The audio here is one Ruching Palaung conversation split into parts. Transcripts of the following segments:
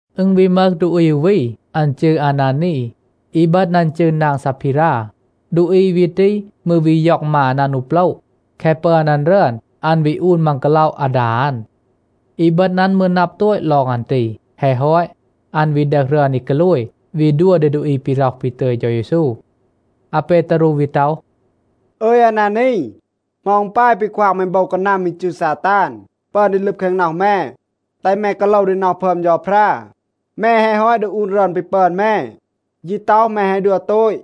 อึณ วี มึห ดูอี อู วี, อัน จืร อานานี. อีบึณ อัน จืร นาง ซาพีรา. ดูอี วี ตี มืร วี ย็อง มาน อัน อู โปละ. แคะ ปึอน อัน รึอน, อัน วี อูน มัง กาล็อะ อาดา อัน. อีบึณ อัน มืร นับ โตต ลอง อัน ตี. แฮะ ฮอต, อัน วี ดึห รึอน อี กาโลย, วี ดัว ดี ดูอี ปี ร็อห ปี ตึย เฌา เยซู. อาเปตารู วี ต็อห, “อึย, อานานี, เหมา อึณ ปาย ปี ควาง แม โบว กานัม อี จืร ซาตาน ปึอน ดี ลึบ แคง น็อห แม, แตห แม กาโลว ดี น็อห พึอม เฌาพรา? แม แฮะ ฮอต ดึห อูน รึอน ปี ปึอน แม, ยี ต็อห, แม แฮะ ดัว โตต.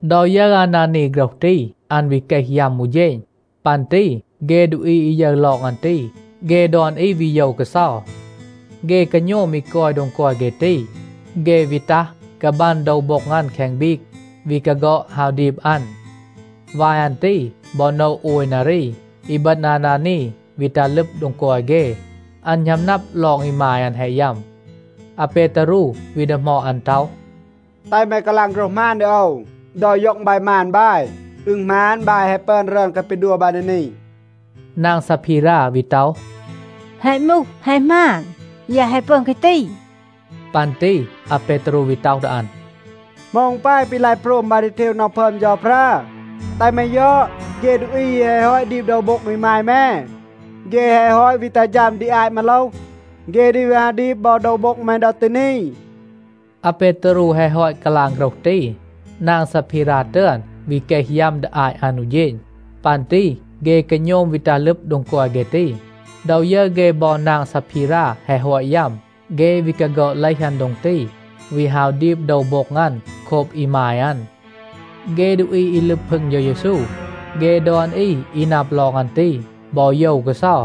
ดอ ยึร อานานี โฆรห ตี, อัน วี เกห ยัม อู เฌณ. ปัน ตี เฆ ดูอี อี ยึร ลอง อัน ตี, เฆ ดอน อี วี โยว กาเซา. เฆ กาโณม อี กอย โดง กอย เฆ ตี, เฆ วี ตัห, กาบัน โดว โบ็ง อัน แคง บีก, วี กาฆอด ฮาว ดีบ อัน. วาย อัน ตี บอ โนะ โอย นารี, อีบึณ อานานี วี ตัห ลึบ โดง กอย เฆ. อัน หณัม นับ ลอง อีมาย อัน แฮะ ยัม. อาเปตารู วี ดีหมอด อัน ต็อห, “แตห แม กาลาง โฆรห หมาน ดี โอว. ดอ ย็อง บาย มาน บาย, อึณ หมาน, บาย แฮะ ปึอน รึอน แคะ ปี ดัว บาย ดี นี?” นาง ซาพีรา วี ต็อห, “แฮะ มูห, แฮะ หมาน. ยาย แฮะ ปึอน แคะ ตี.” ปัน ตี อาเปตารู วี ต็อห ดี อัน, “เหมา อึณ ปาย ปี ลาย โพรม บาย ดี เทว น็อห พึอม เฌาพรา? แตห แม ยอด. เฆ ดูอี อี แฮะ ฮอต ดีบ โดว โบ็ง อีมาย แม, เฆ แฮะ ฮอต วี ตัห ฌัม ดี อาต มาโลห. เฆ ดี วี ฮาว ดีบ บอ โดว โบ็ง แม ดอ ตี นี.” อาเปตารู แฮะ ฮอต กาลาง โฆรห ตี, นาง ซาพีรา ตึอน วี เกห ยัม ดี อาต อัน อู เฌณ. ปัน ตี เฆ กาโณม วี ตัห ลึบ โดง กอย เฆ ตี. ดอ ยึร เฆ บอ นาง ซาพีรา แฮะ ฮอต ยัม, เฆ วี กาฆอด เลห อัน โดง ตี, วี ฮาว ดีบ โดว โบ็ง อัน โคบ อีมาย อัน. เฆ ดูอี อี ลึบ พึง เฌา เยซู, เฆ ดอน อี อี นับ ลอง อัน ตี บอ โยว กาเซา.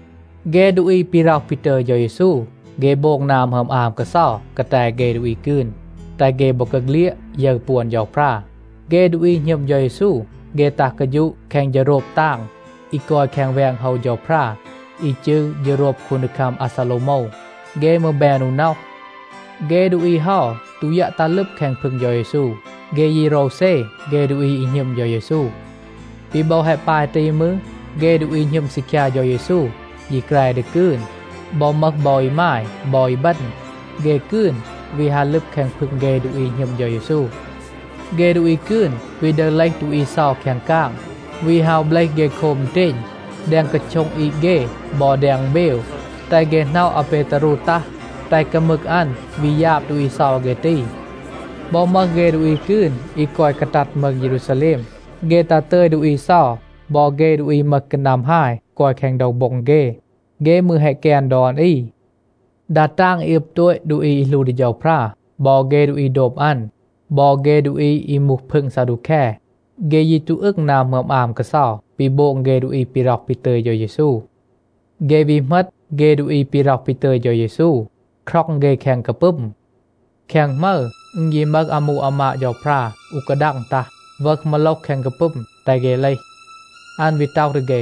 เฆ ดูอี ปี ร็อห ปี ตึย เฌา เยซู, เฆ โบง นา หมึอม อาม กาเซา กาแต เฆ ดูอี กืน, แตห เฆ บอกาเฆลียด ยึร ปวน เฌาพรา. เฆ ดูอี หณึม เฌา เยซู, เฆ ตัห กาฌูะ แคง เฌโรบ ตาง อี กอย แคง แวง โฮว เฌาพรา อี จืร เฌโรบ คูนดีคัม อาซาโลวโมว. เฆ มืร แบน อู น็อห. เฆ ดูอี เฮา ตู ยัะ ตัห ลึบ แคง พึง เฌา เยซู. เฆ ยี โรวเซ เฆ ดูอี อี หณึม เฌา เยซู. ปี บอ แฮะ ปาย ตี มืร, เฆ ดูอี หณึม ซีคยา เฌา เยซู ยี แกร ดี กืน. บอ มึห บอ อีมาย บอ อีบึณ, เฆ กืน วี ฮา ลึบ แคง พึง เฆ ดูอี หณึม เฌา เยซู. เฆ ดูอี กืน วี ดึห เลห ดูอี เซา แคง กาง, วี ฮาว เบลห เฆ โคบ อึณเตณ แดง กาโช็ง อีด เฆ บอ แดง อึณเบว, แตห เฆ หน็อะ อาเปตารู ตัห, แตห กามึก อัน วี ยาบ ดูอี เซา เฆ ตี. บอ มึห เฆ ดูอี กืน อี กอย กาตัด มืง เยรูซาแลม, เฆ ตัห ตึย ดูอี เซา บอ เฆ ดูอี มึห กานัม ฮาย กอย แคง โดว โบ็ง เฆ. เฆ มืร แฮะ แกน ดอน อี. ดา ตาง อี อึบ โตต ดูอี อี หลู ดี เฌาพรา บอ เฆ ดูอี โดบ อัน บอ เฆ ดูอี อี มูห พึง ซาดูแค, เฆ ยี ตู อึง นา หมึอม อาม กาเซา ปี โบง เฆ ดูอี ปี ร็อห ปี ตึย เฌา เยซู. เฆ วี เหมต เฆ ดูอี ปี ร็อห ปี ตึย เฌา เยซู, คร็อง เฆ แคง กาปึม. แคง หมึร อึณ ยี มึห อามู อามาด เฌาพรา อู กาดัง ตัห, วึห มาโลห แคง กาปึม, แตห เฆ เลห. อัน วี ต็อห ดี เฆ,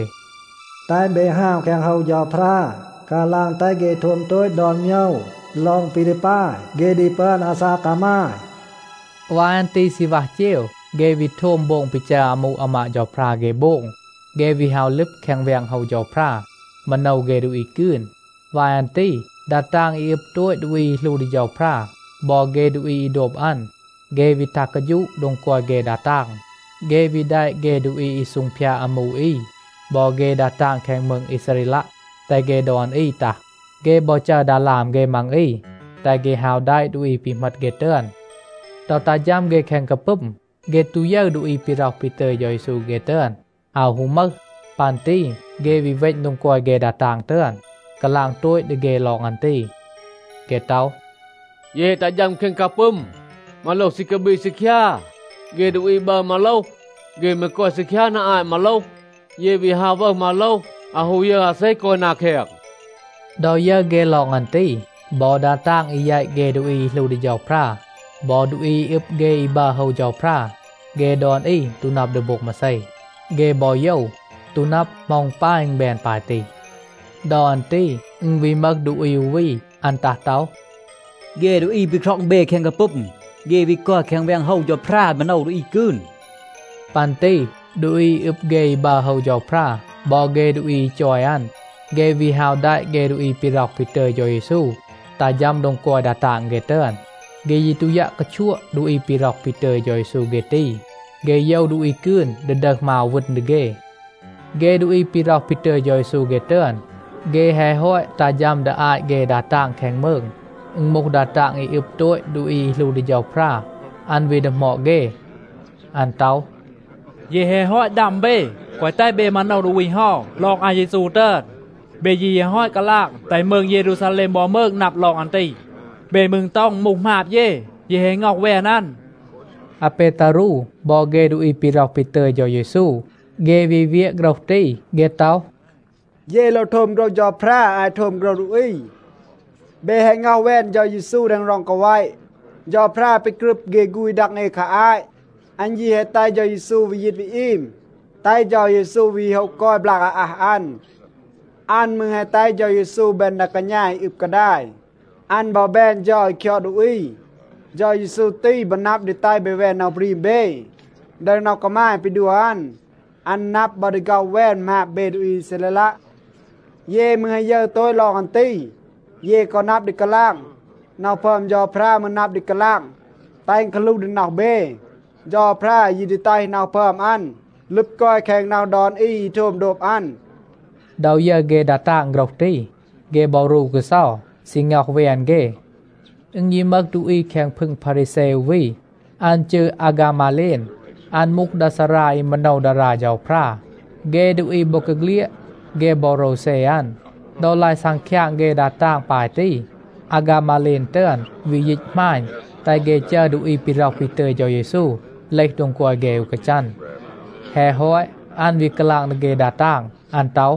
“แตห เบ ฮาว แคง โฮว เฌาพรา, กาลาง แตห เฆ โทม โตต ดอน โมยว ลอง ปี ดี ปาย เฆ ดี ปึอน อาซาก กามาย.” วาย อัน ตี ซีณวัห เจว เฆ วี โทม โบง ปี จัร อามู อามาด เฌาพรา เฆ โบง. เฆ วี ฮาว ลึบ แคง แวง โฮว เฌาพรา, มาโนว เฆ ดูอี กืน. วาย อัน ตี ดา ตาง อี อึบ โตต ดูอี อี หลู ดี เฌาพรา บอ เฆ ดูอี อี โดบ อัน, เฆ วี ตัห กาฌูะ โดง กอย เฆ ดา ตาง. เฆ วี แดะ เฆ ดูอี อี ซูงพยาด อามู อี บอ เฆ ดา ตาง แคง มืง อีซาเรลัะ, แตห เฆ ดอน อี ตัห. เฆ บอ จัร ดาลาม เฆ มัง อี, แตห เฆ ฮาว แดะ ดูอี ปี เหมต เฆ ตึอน. ดอ ตัห ฌัม เฆ แคง กาปึม, เฆ ตู ยึร ดูอี ปี ร็อห ปี ตึย เฌา เยซู เฆ ตึอน. อาว ฮู มึห. ปัน ตี เฆ วี เวณ โดง กอย เฆ ดา ตาง ตึอน, กาลาง โตต ดี เฆ ลอง อัน ตี. เฆ ต็อห, “เย แฮะ ตัห ฌัม แคง กาปึม. มาโลห ซี กาบีด ซีคยา. เฆ ดูอี บัร มาโลห, เฆ มืร กอย ซีคยา นา อาต มาโลห. เย วี ฮาว วึห มาโลห, อาว ฮู ยึร อาเซ กอย นา แคง.” ดอ ยึร เฆ ลอง อัน ตี, บอ ดา ตาง อี แยต เฆ ดูอี อี หลู ดี เฌาพรา บอ ดูอี อี อึบ เฆ อี บัร โฮว เฌาพรา, เฆ ดอน อี ตู นับ ดี โบง มาเซ. เฆ บอ โยว, ตู นับ, เหมา อึณ ปาย อึณ แบน ปาย ตี. ดอ อัน ตี อึณ วี มึห ดูอี อู วี, อัน ตัห ต็อห, “เฆ ดูอี ปี คร็อง เบ แคง กาปึม, เฆ วี กอย แคง แวง โฮว เฌาพรา, มาโนว เฆ ดูอี กืน.” ปัน ตี ดูอี อี อึบ เฆ อี บัร โฮว เฌาพรา บอ เฆ ดูอี อี จอย อัน, เฆ วี ฮาว แดะ เฆ ดูอี ปี ร็อห ปี ตึย เฌา เยซู ตัห ฌัม โดง กอย ดา ตาง เฆ ตึอน. เฆ ยี ตู ยัะ กาชัวะ ดูอี ปี ร็อห ปี ตึย เฌา เยซู เฆ ตี. เฆ โยว ดูอี กืน ดี ดึห มาว วึณ ดี เฆ. เฆ ดูอี ปี ร็อห ปี ตึย เฌา เยซู เฆ ตึอน, เฆ แฮะ ฮอต ตัห ฌัม ดี อาต เฆ ดา ตาง แคง มืง, อึณ มูห ดา ตาง อี อึบ โตต ดูอี อี หลู ดี เฌาพรา, อัน วี ดีหมอด เฆ. อัน ต็อห, “เย แฮะ ฮอต ดัม เบ, แกวะ แตห เบ มาโนว ดูอี เฮา ลอง อาเยซู ตึอน. เบ ยี แฮะ ฮอต กาลาง แตห มืง เยรูซาแลม บอ มืง นับ ลอง อัน ตี. เบ มืร ต็อห อึณ มูห หมาบ เย, เย แฮะ ง็อห แวน อัน.” อาเปตารู บอ เฆ ดูอี ปี ร็อห ปี ตึย เฌา เยซู, เฆ วี เวียะ โฆรห ตี. เฆ ต็อห, “เย โลว โทม โฆรห เฌาพรา อาต โทม โฆรห ดูอี. เบ แฮะ ง็อห แวน เฌา เยซู แดง ร็อง กาแวะ. เฌาพรา ปี กรึบ เฆ ฆูณ ดัง เอ คา อาต อัน ยี แฮะ แตห เฌา เยซู วี ยีต วี อีม, แตห เฌา เยซู วี โฮะ กอย บลาก อาอัห อัน. อัน มืร แฮะ แตห เฌา เยซู แบน ดา กาณา อี อึบ กาดาย. อัน บอ แบน เฌา อี คยอด ดูอี. เฌา เยซู ตี บอ นับ ดี แตห เบ แวน น็อห บรีม เบ, ดึห น็อห กามาย ปี ดัว อัน. อัน นับ บอ ดี ฆ็อห แวน หมาบ เบ ดูอี อีซาเรลัะ. เย มืร แฮะ ยึร โตต ลอง อัน ตี, เย กอ นับ ดี กาลาง. น็อห พึอม เฌาพรา มืร นับ ดี กาลาง, แตห อึณ กาหลูห ดี น็อห เบ. เฌาพรา ยี ดี แตห น็อห พึอม อัน ลึบ กอย แคง น็อห ดอน อี อี โทม โดบ อัน.” ดอ ยึร เฆ ดา ตาง โฆรห ตี, เฆ บอ รู กาเซา, ซี ง็อห แวน เฆ. อึณ ยี มึห ดูอี แคง พึง พารีแซ อู วี, อัน จืร อาฆามาเลน. อัน มูห ดา ซารา อี มาโนว ดารา เฌาพรา. เฆ ดูอี บอกาเฆลียด, เฆ บอ โรวเซ อัน. ดอ ลาย ซังคยาง เฆ ดา ตาง ปาย ตี, อาฆามาเลน ตึอน วี ยีต หมาณ, แตห เฆ จัร ดูอี ปี ร็อห ปี ตึย เฌา เยซู เลห โดง กอย เฆ อู กาจัน. แฮะ ฮอต, อัน วี กาลาง ดี เฆ ดา ตาง. อัน ต็อห,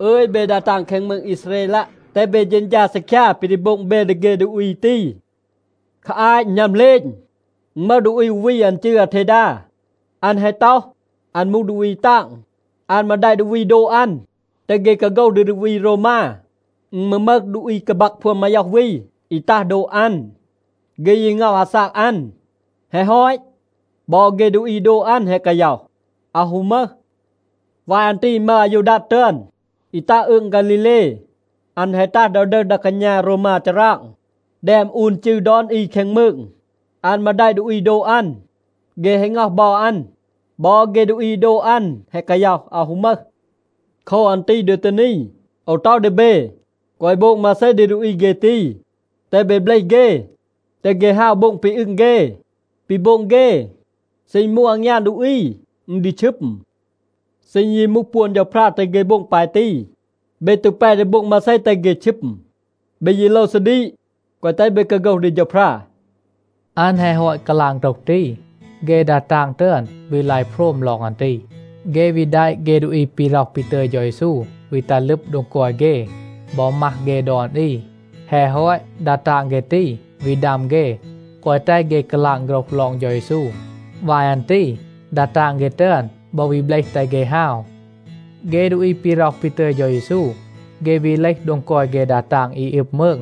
“อึย, เบ ดา ตาง แคง มืง อีซาเรลัะ, แตห เบ เฌณฌา ซีคยา ปี ดี โบง เบ ดี เฆ ดูอี ตี. คา อาต อึณ หณัม เหลณ, อึณ มึห ดูอี อู วี, อัน จืร อาเทดา. อัน แฮะ ต็อห, อัน มูห ดูอี ตาง. อัน มืร แดะ ดูอี โดบ อัน, แตห เฆ กาโฆห ดี ดูอี โรวมา. อึณ มืร มึห ดูอี กาบัก พวน มาย็อห วี, อี ตัห โดบ อัน. เฆ ยี ง็อห อาซาก อัน. แฮะ ฮอต, บอ เฆ ดูอี อี โดบ อัน แฮะ กาย็อห, อาว ฮู มึห. วาย อัน ตี อึณ มึห อายูดัด ตึอน, อี ตัห อืง ฆาลีเล. อัน แฮะ ตัห ดอ ดึห ดา กาณา โรวมา ฌาราง, แดม อูน จืร ดอน อี แคง มืง. อัน มืร แดะ ดูอี โดบ อัน. เฆ แฮะ ง็อห บอ อัน. บอ เฆ ดูอี อี โดบ อัน แฮะ กาย็อห, อาว ฮู มึห. โคว อัน ตี ดอ ตี นี, โอว ต็อห ดี เบ, แกวะ โบง มาเซ ดี ดูอี เฆ ตี. แตห เบ เบลห เฆ, แตห เฆ ฮาว, โบง ปี อึง เฆ. ปี โบง เฆ, เซ อึณ มูห อางยาน ดูอี, อึณ ดี ชึม. เซ อึณ ยี มูห ปวน เฌาพรา, แตห เฆ โบง ปาย ตี, เบ ตู แป ดี โบง มาเซ, แตห เฆ ชึม. เบ ยี โลว ซาดีก, แกวะ แตห เบ กาโฆห ดี เฌาพรา.” อัน แฮะ ฮอต กาลาง โฆรห ตี, เฆ ดา ตาง ตึอน วี ลาย โพรม ลอง อัน ตี. เฆ วี แดะ เฆ ดูอี ปี ร็อห ปี ตึย เฌา เยซู วี ตัห ลึบ โดง กอย เฆ บอ มัห เฆ ดอน อี. แฮะ ฮอต, ดา ตาง เฆ ตี วี ดัม เฆ, แกวะ แตห เฆ กาลาง โฆรห ลอง เฌา เยซู. วาย อัน ตี ดา ตาง เฆ ตึอน บอ วี เบลห, แตห เฆ ฮาว. เฆ ดูอี ปี ร็อห ปี ตึย เฌา เยซู, เฆ วี เลห โดง กอย เฆ ดา ตาง อี อึบ มืง.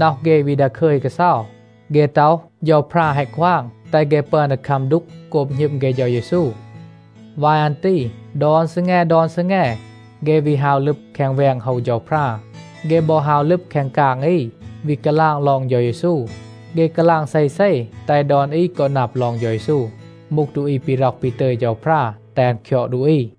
น็อห เฆ วี ดาคึย กาเซา. เฆ ต็อห, เฌาพรา แฮะ ควาง, แตห เฆ ปึอน ดี คัม ดูก โกบ หณึม เฆ เฌา เยซู. วาย อัน ตี ดอน ซีแง, ดอน ซีแง, เฆ วี ฮาว ลึบ แคง แวง โฮว เฌาพรา, เฆ บอ ฮาว ลึบ แคง กาง อี, วี กาลาง ลอง เฌา เยซู. เฆ กาลาง เซเซ แตห ดอน อี กอ นับ ลอง เฌา เยซู มูห ดูอี ปี ร็อห ปี ตึย เฌาพรา แตห อัน คยอด ดูอี.